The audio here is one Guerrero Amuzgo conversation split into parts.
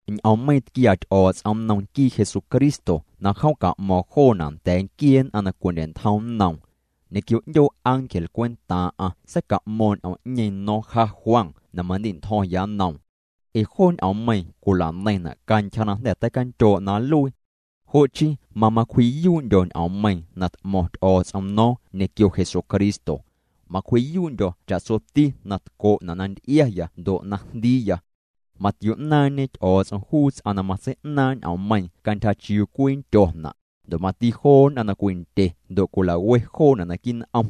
Ñ'oommeiiⁿ tquiaa Ty'o̱o̱ts'om nnom nquii Jesucristo na jom ca'mo̱o̱ⁿ joona' nda̱a̱ nquiee nn'aⁿ na cwindye'ntjom nnoom. Ñequio 'ndyoo ángel cwentaaⁿ'aⁿ seica'mo̱o̱ⁿ ñ'oom'ñeeⁿ no̱o̱ⁿ ja Juan na mandi'ntjo̱ⁿya nnoom. Ee joo ñ'oommeiiⁿ cwila'neiⁿna' cantyja na jnda̱ teicandyoo' na nluii. Jo' chii mamacwji'yuu'ndyo̱ ñ'oommeiiⁿ na t'mo̱ⁿ Ty'o̱o̱ts'om no̱o̱ⁿ ñequio Jesucristo. Macwji'yuu'ndyo̱ cha'tsoti na tco'na' na nty'iaya ndo' na jndiiya. Matio'naaⁿñe Ty'o̱o̱ts'om juu ts'aⁿ na matsei'naaⁿ' ñ'oommeiiⁿ cantyja chiuu cwii nndyona', ndo' mati joo nn'aⁿ na cwindye ndo' cwila'we joona' naquii' n'om.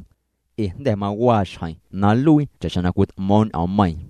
Ee jnda̱ mawaa xjeⁿ na nluii cha'xjeⁿ na cwit'mo̱o̱ⁿ ñ'oommeiiⁿ.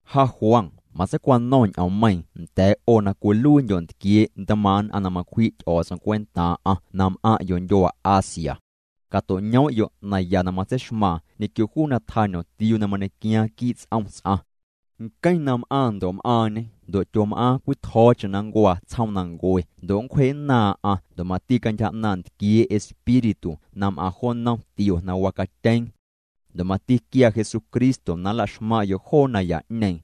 Ja Juan matseicwano̱ⁿ ñ'oommeiiⁿ nda̱a̱' 'o na cwiluiindyo' ntquiee' ntmaaⁿ' nn'aⁿ na macwji' Ty'o̱o̱ts'om cwentaaⁿ'aⁿ na m'aⁿ'yo' ndyuaa Asia. Cato'ñoom'yo' naya na matseixmaaⁿ ñequio juu na tjañomtiuu na mañequiaaⁿ quii' ts'om ts'aⁿ. Nqueⁿ na m'aaⁿ ndo' m'aaⁿñê ndo' tyom'aaⁿ cwitjo̱o̱cheⁿ na nncuaa tsjoomnancue ndo' nncwjee'nnaaⁿ'aⁿ ndo' mati cantyja 'naaⁿ ntquiee' Espíritu na m'aⁿna jo nnom tio na wacatyeeⁿ. Ndo' mati quiaa Jesucristo na nla'xmaⁿ'yo' joo naya'ñeeⁿ.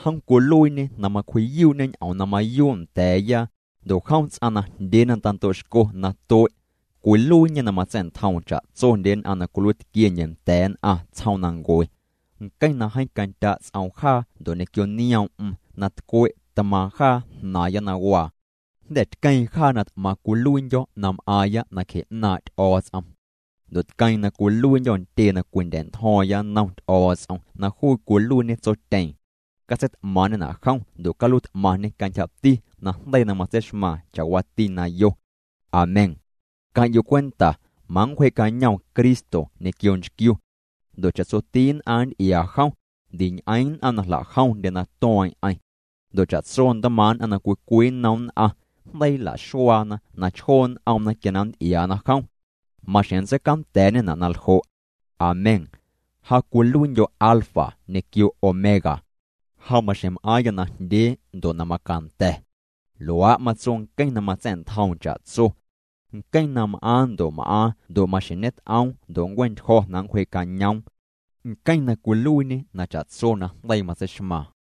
Jom cwiluiiñê na macwji'yuu'ñê ñ'oom na mayuu' nda̱a̱ya, ndo' jom ts'aⁿ najndyee na tando'xco na tue'. Cwiluiiñê na matsa̱'ntjoom cha'tsondye nn'aⁿ na cwiluiitquiendye nda̱a̱ nn'aⁿ tsjoomnancue. Nqueⁿ na jeeⁿ candya' ts'oom jaa ndo' ñequio nioom'm na tcwe' tmaaⁿ jaa jnaaⁿya na waa. Jnda̱ tqueeⁿ jaa na t'maⁿ cwiluiindyo̱ na m'aaⁿya nacje 'naaⁿ' Ty'o̱o̱ts'om. Ndo' tqueeⁿ na cwiluiindyo̱ ntyee na cwindya̱'ntjo̱o̱ⁿya nnom Ty'o̱o̱ts'om na juu cwiluiiñe Tsotyeeⁿ. Catseit'maaⁿ'ñena' jom ndo' caluiit'maⁿñê cantyjati najndeii na matseixmaaⁿ cha'waati na yo. Amén. Queⁿ'yo' cwenta, manncwjee'cañoom Cristo ñequio nchquiu. Ndo' cha'tsoti nn'aⁿ nnty'iaa jom, ndiñ'eeⁿ nn'aⁿ na jla'jomndye na tueeⁿ'eⁿ. Ndo' cha'tso ntmaaⁿ' na cwii cwii nnom nn'aⁿ, jndeii nla'xuaana na chjoo' n'omna quia na nnty'iaana jom. Maxjeⁿ nntseicanda̱a̱'ñena' na ljo'. Amén. “Ja cwiluiindyo̱ Alfa ñequio Omega. Ja maxjeⁿ m'aaⁿya najndyee ndo' na macanda̱.” Luaa' matso nqueⁿ na matsa̱'ntjoom cha'tso. Nqueⁿ na m'aaⁿ ndo' m'aaⁿ ndo' maxjeⁿ ñet'oom ndo' nncue'ntyjo̱ na nncwjee'cañoom. Nqueⁿ na cwiluiiñê na cha'tso najndeii matseixmaaⁿ.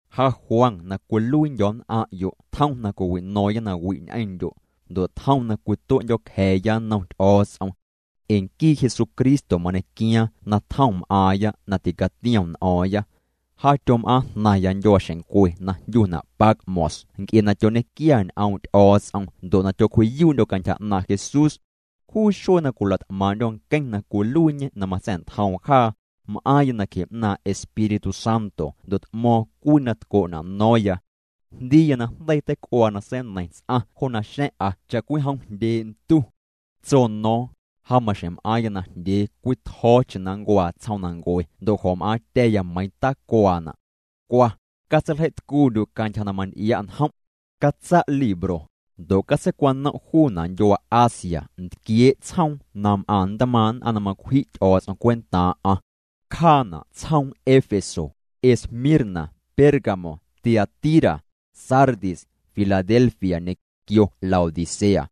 Ja Juan na cwiluiindyo̱ nn'aⁿ'yo' tjom na cwiwino̱o̱ⁿya nawi' ñ'eⁿndyo', ndo' tjom na cwitue'ndyo̱cja̱a̱ya nnom Ty'o̱o̱ts'om. Ee nquii Jesucristo mañequiaaⁿ na tjom m'aaⁿya na ticatiom n'o̱o̱ⁿya. Ja tyom'aaⁿjnaⁿya ndyuaaxeⁿncwe na jndyuna' Patmos nc'e na tyoñequia ñ'oom' Ty'o̱o̱ts'om ndo' na tyocwji'yuu'ndyo̱ cantyja 'naaⁿ' Jesús. Juu xuee na cwila't'maaⁿ'ndyo̱ nqueⁿ na cwiluiiñê na matsa̱'ntjoom jaa, m'aaⁿya nacje 'naaⁿ' Espíritu Santo ndo' t'mo̱o̱ⁿ cwii na tco'na' no̱o̱ⁿya. Jndiiya na jndeii teic'uaa na seineiⁿ ts'aⁿ jo naxa̱ⁿ'a cha'cwijom jndyee' ntu. Tso no̱o̱ⁿ: —Ja maxjeⁿ m'aaⁿya najndyee cwii tjo̱o̱cheⁿ na nncuaa tsjoomnancue ndo' jo̱m'aaⁿtya̱ya meiiⁿ na tacuaana'. Cwa, catseiljei'tcuundyu' cantyja na manty'ia' njom'. Catsa' libro, ndo' catseicwanom' juuna' ndyuaa Asia ntquiee' tsjoom na m'aⁿ ntmaaⁿ' nn'aⁿ na macwji' Ty'o̱o̱ts'om cwentaaⁿ'aⁿ. Cjaana' tsjoom Éfeso, Esmirna, Pérgamo, Tiatira, Sardis, Filadelfia, ñequio Laodicea.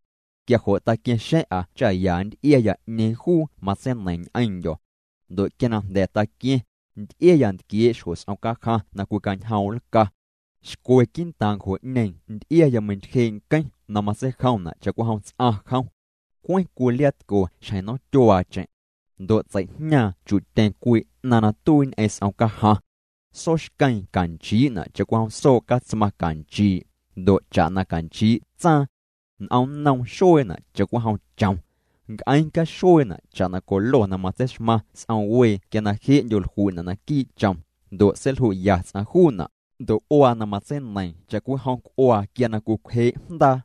Quia jo' taqua̱ⁿxa̱ⁿ'a cha ya nnty'iaya 'ñeeⁿ juu matseineiⁿ ñ'eⁿndyo̱. Ndo' quia na jnda̱ taqua̱ⁿ, nty'iaya ntquiee' xjo s'om cajaⁿ na cwicañjoom' nlca. Xcwe quii'ntaaⁿ ncjo'ñeeⁿ nty'iaya meintyjee' nqueⁿ na matseijomna' cha'cwijom ts'aⁿ jom. Cweⁿ cwii liaatco xjeⁿ nomtyuaacheⁿ. Ndo' tsei'jñaaⁿ chu'tyeⁿ cwii 'naⁿ na tuii ñ'eⁿ s'om cajaⁿ. Sooxqueeⁿ canchii'na' cha'cwijom soo' catsmaⁿ canchii', ndo' cha'na canchii' tsaaⁿ. N'omnnoom xueena' cha'cwijom chom. Nc'eeⁿ caxueena' cha'na colo na matseixmaⁿ s'om wee quia na je'ndyo jlui'na' naquii' chom, ndo' seilju'ya ts'aⁿ juuna'. Ndo' c'uaa na matseineiiⁿ cha'cwijom c'uaa quia na cwicwjee' jndaa.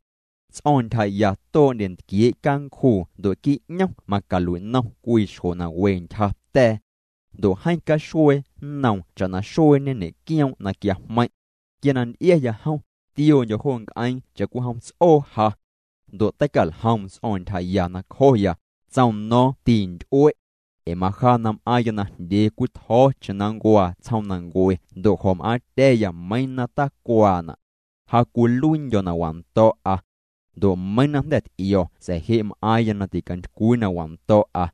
Ts'o̱o̱ⁿ ntyjaya too'ndye ntquiee' cancjuu ndo' quii' 'ñom macalui'nom cwii xjo na we ntyja ta̱a̱. Ndo' jeeⁿ caxuee nnoom cha'na xueeñe ñe'quioom' na quiajmeiⁿ'. Quia na nty'iaya jom, tioondyo̱ jo nc'eeⁿ cha'cwijom ts'oo ja. Ndo' teicaljoom ts'o̱o̱ⁿ ntyjaya nacjoya, tsoom no̱o̱ⁿ: —Tinty'ue'. Ee maja na m'aaⁿya najndyee cwii tjo̱o̱cheⁿ na nncuaa tsjoomnancue ndo' jo̱m'aaⁿtya̱ya meiiⁿ na tacuaana'. Ja cwiluiindyo̱ na wando̱'a. Ndo' meiiⁿ na jnda̱ t'io̱ sa̱a̱ je' m'aaⁿya na ticantycwii na wando̱'a.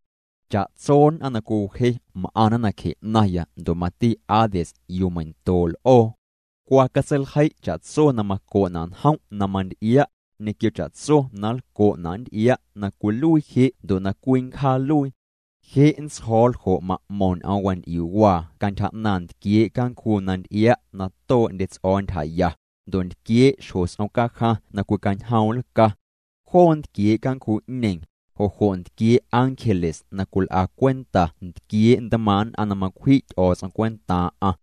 Cha'tso nn'aⁿ na cwiwje m'aⁿna nacje 'naⁿya ndo' mati Hades yuu meindoo' l'oo. Cwa catseiljei' cha'tso na maco'na' njom' na manty'ia', ñequio cha'tso na nlco'na' nnty'ia' na cwiluii je' ndo' na cwii nncjaaluii. Je' nntsjo̱o̱ ljo' ma'mo̱ⁿ ñ'oom wanty'iuu'waa cantyja 'naaⁿ ntquiee' cancjuu na nty'ia' na too'ndye ts'o̱o̱ ntyjaya, ndo' ntquiee' xjo s'om cajaⁿ na cwicañjoom' nlca. Joo ntquiee' cancjuu'ñeeⁿ, jo' jo' ntquiee' ángeles na cwil'a cwenta ntquiee' ntmaaⁿ' nn'aⁿ na macwji' Ty'o̱o̱ts'om cwentaaⁿ'aⁿ.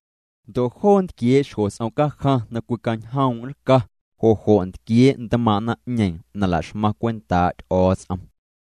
Ndo' joo ntquiee' xjo s'om cajaⁿ na cwicañjoom' nlca, jo' jo' ntquiee' ntmaaⁿ' naⁿ'ñeeⁿ na la'xmaⁿ cwentaa' Ty'o̱o̱ts'om.